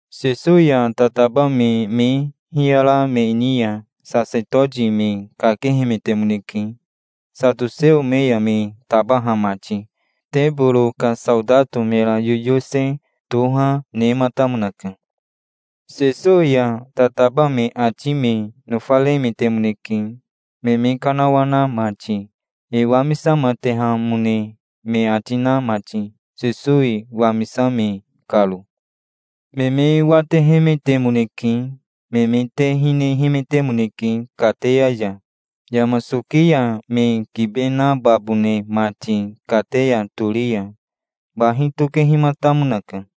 Sesowi ya tataba me me hiyara me ni ya sasetoti me kakehemetemoneke, satoseo me ya me tabaha mati. Teboro ka saotato mera yoyose toha nematamonaka. Sesowi ya tataba me ati me nofaremetemoneke, me me kanawana mati, e wamisamatehamone me ati na mati, Sesowi wamisame karo. Me me watehemetemoneke. Me me te hinehemetemoneke kateya ya, yama soki ya me kibe nababone mati kateya tori ya. Bahi tokehimatamonaka.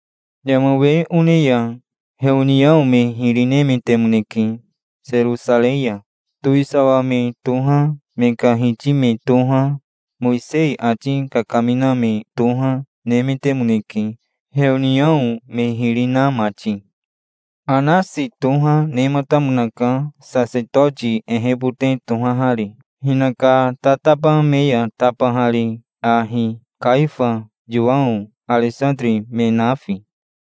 Yama we one ya heoniao me hiri nemetemoneke, Serosarei ya. Towisawa me toha, me ka hiti me toha, Mowisei ati kakamina me toha, nemetemoneke, heoniao me hiri na mati. Anasi toha nematamonaka, sasetoti ehebote tohahari, hinaka tataba me ya tabahari ahi, Kaifa, Yowao, Aresatiri, me nafi.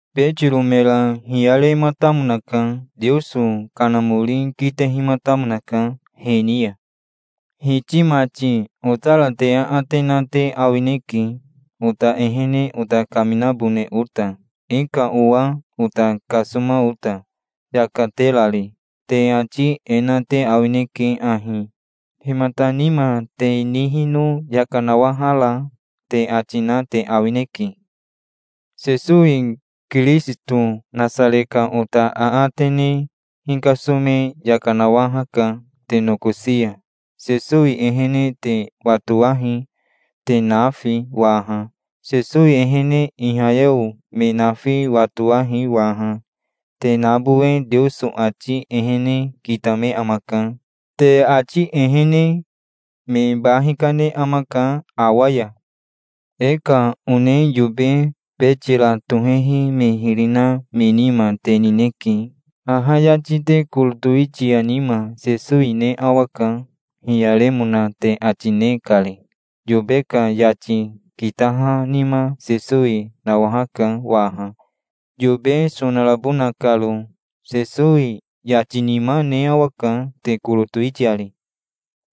Betiro mera hiyarematamonaka. Teoso Kanamori kitehimatamonaka he ni ya. "Hiti mati, otara te aate na te awineke, ota ehene ota kaminabone ota, e ka owa ota kasoma ota, yaka terari. Te ati e na te awineke ahi: 'Himata nima te nihino yaka nawahara?' te ati na te awineke. Sesowi Kirisito Nasare ka ota aate ne hikasome yaka nawahaka te nokosi ya. Sesowi ehene te watowahi, te nafi waha. Sesowi ehene ihayeo me nafi watowahi waha. Te nabowe Teoso ati ehene kitame amaka. Te ati ehene me ba hikane amaka awa ya. E ka one yobe betira tohehi me hiri na me nima te nineke. Haha yati te koro towitia nima Sesowi ne awaka, hiyaremona te ati ne kari. Yobe ka yati kitaha nima Sesowi nawahaka waha, yobe sonarabona karo. Sesowi yati nima ne awaka te koro towitiari.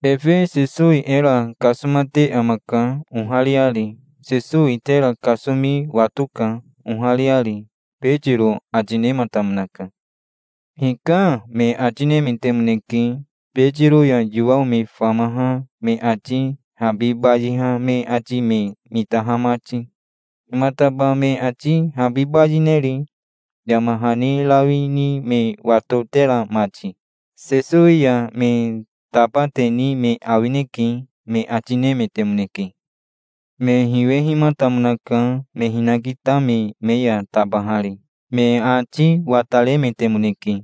Efe Sesowi era kasomate amaka, ohariari. Sesowi tera kasomi watoka, ohariari", Betiro ati nematamonaka. "Hika", me ati nemetemoneke, Betiro ya Yowao me famaha me ati habi bayiha me ati me mitaha mati. "Himataba me ati habi bayineri, yama hani rawi ni me watotera mati? Sesowi ya me tabateni me awineke", me ati nemetemoneke. Me hiwehimatamonaka me hinakitame me ya tabahari. Me ati wataremetemoneke.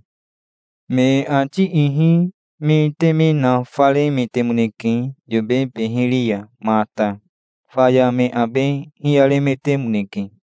Me ati ihi me teme nafaremetemoneke yobe beheri ya mata. Faya me abe hiyaremetemoneke.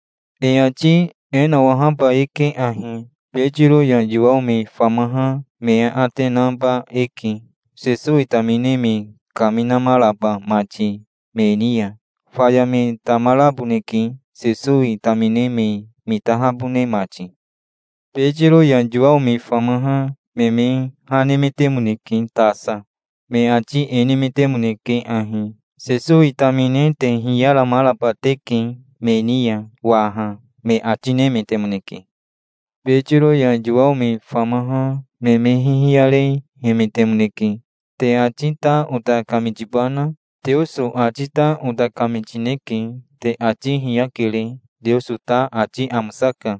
E ati e nawahaba eke ahi: Betiro ya Yowao me famaha me e aate naba eke, Sesowi tamine me kaminamaraba mati me ni ya. Faya me tamamaraboneke, Sesowi tamine me mitahabone mati. Betiro ya Yowao me famaha me me ha nemetemoneke tasa. Me ati e nemetemoneke ahi: "Sesowi tamine te hiyaramaraba teke me ni ya waha", me ati nemetemoneke. Betiro ya Yowao me famaha me me hihiyarehemetemoneke. "Te ati ta ota kamitibana? Teoso ati ta ota kamitineke. Te ati hiyakere. Teoso ta ati amosaka.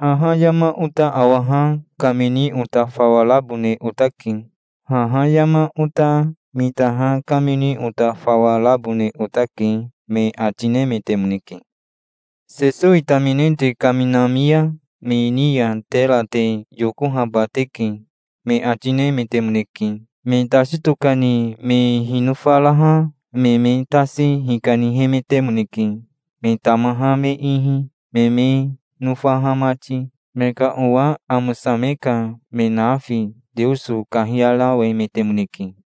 Haha yama ota awaha kamini ota fawa rabone otake. Haha yama ota mitaha kamini ota fawa rabone otake, me ati nemetemoneke. "Sesowi tamine te kaminami ya me ni ya tera te yokohaba teke", me ati nemetemoneke. Me tasi tokani me hinofaraha me me tasi hikanihemetemoneke, me tamaha me ihi, me me nofaha mati. Me ka owa amosame ka me nafi Teoso kahiyarawemetemoneke.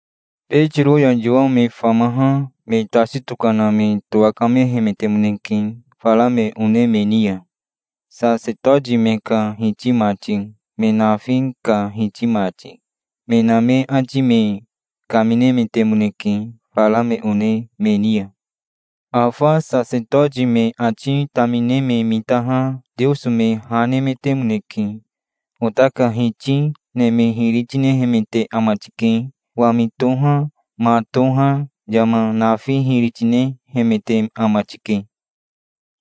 Betiro ya Yowao me famaha me tasi tokana me towakamehemetemoneke fara me one me ni ya. Sasetoti me ka hiti mati, me nafi ka hiti mati, me na me ati me kaminemetemoneke fara me one me ni ya. Afa sasetoti me ati tamine me mitaha Teoso me ha nemetemoneke. "Ota ka Hiti neme hiri tinehemete ama tike. Wami toha, ma toha, yama nafi hiri tinehemete ama tike.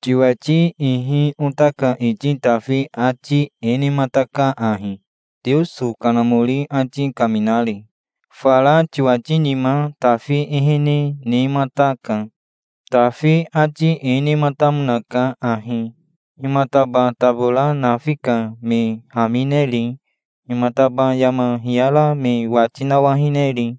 Tiwati ihi ota ka iti Tafi ati e nemataka ahi, Teoso Kanamori ati kaminari. Fara tiwati nima Tafi ehene nemataka. Tafi ati e nematamonaka ahi: 'Himataba tabora nafi ka me hamineri? Himataba yama hiyara me wati nawahineri?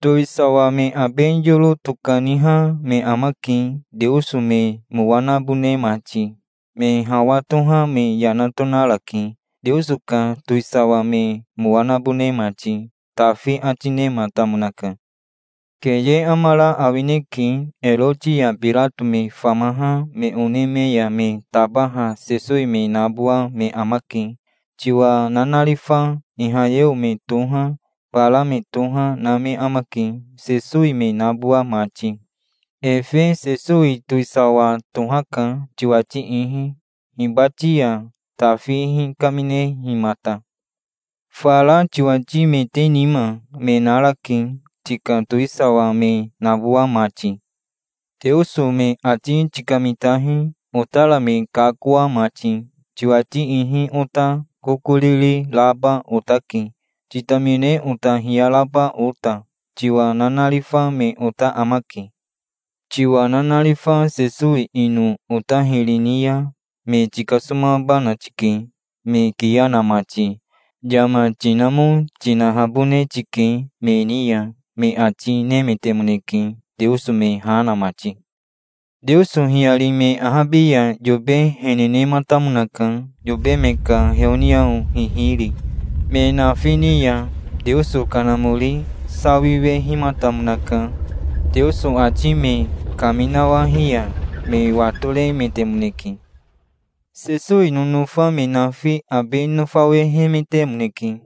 Towisawa me abe yoro tokaniha me amake, Teoso me mowa nabone mati. Me hawa toha me yana tonarake, Teoso ka towisawa me mowa nabone mati, Tafi ati nematamonaka. Keye amara awineke. Eroti ya Birato me famaha me one me ya me tabaha Sesowi me nabowa me amake, tiwa nanarifa. Ihayeo me toha, bara me toha, na me amake, Sesowi me nabowa mati. Efe Sesowi towisawa tohaka, tiwati ihi, hibati ya Tafi hikaminehimata. Fara tiwatimete nima me narake, tika towisawa me nabowa mati. Teoso me ati tikamitahi, otara me kakoa mati. Tiwati ihi ota kokoriri raba otake, titamine ota hiyaraba ota. Tiwa nanarifa me ota amake. Tiwa nanarifa Sesowi ino ota hiri ni ya me tikasomabana tike, me kiya na mati. Yama tinamo, tinahabone tike me ni ya", me ati nemetemoneke, Teoso me ha na mati. Teoso hiyari me ahabi ya yobe hene nematamonaka, yobe me ka heoniao hihiri. Me nafi ni ya Teoso Kanamori sawiwehimatamonaka. Teoso ati me kaminawahi ya me watoremetemoneke. Sesowi nonofa me nafi abe nofawehemetemoneke.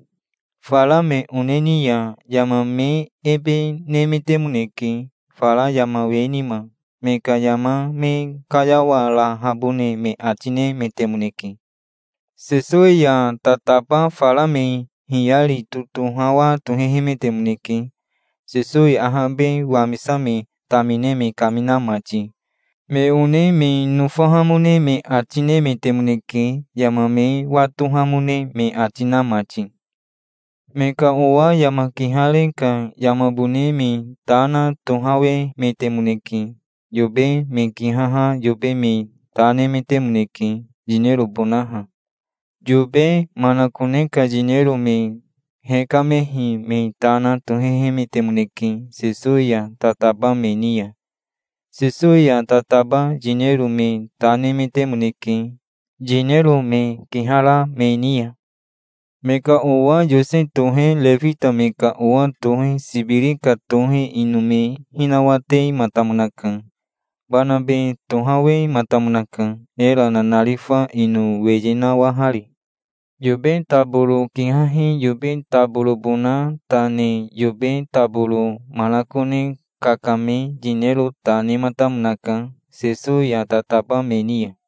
Fara me one ni ya yama me ebe nemetemoneke, fara yama we nima. Me ka yama me kayawarahabone me ati nemetemoneke. Sesowi ya tataba fara me hiyari totohawa tohehemetemoneke Sesowi ahabe wamisame tamine me kamina mati. Me one me nofahamone me ati nemetemoneke, yama me watohamone me ati na mati. Me ka owa yama kihare ka yamabone me ta na tohawemetemoneke. Yobe me kihaha yobe me ta nemetemoneke, yinerobonaha. Yobe manakone ka yinero me hekamehi me ta na tohehemetemoneke Sesowi ya tataba me ni ya. Sesowi ya tataba yinero me ta nemetemoneke, yinero me kihara me ni ya. Me ka owa Yose tohe refita me ka owa tohe Sibiri ka tohe ino me hinawatematamonaka. Banabe tohawematamonaka, era nanarifa ino weye nawahari. Yobe taboro kihahi yobe taborobona ta ne yobe taboro manakone kakame yinero ta nematamonaka Sesowi ya tataba me ni ya.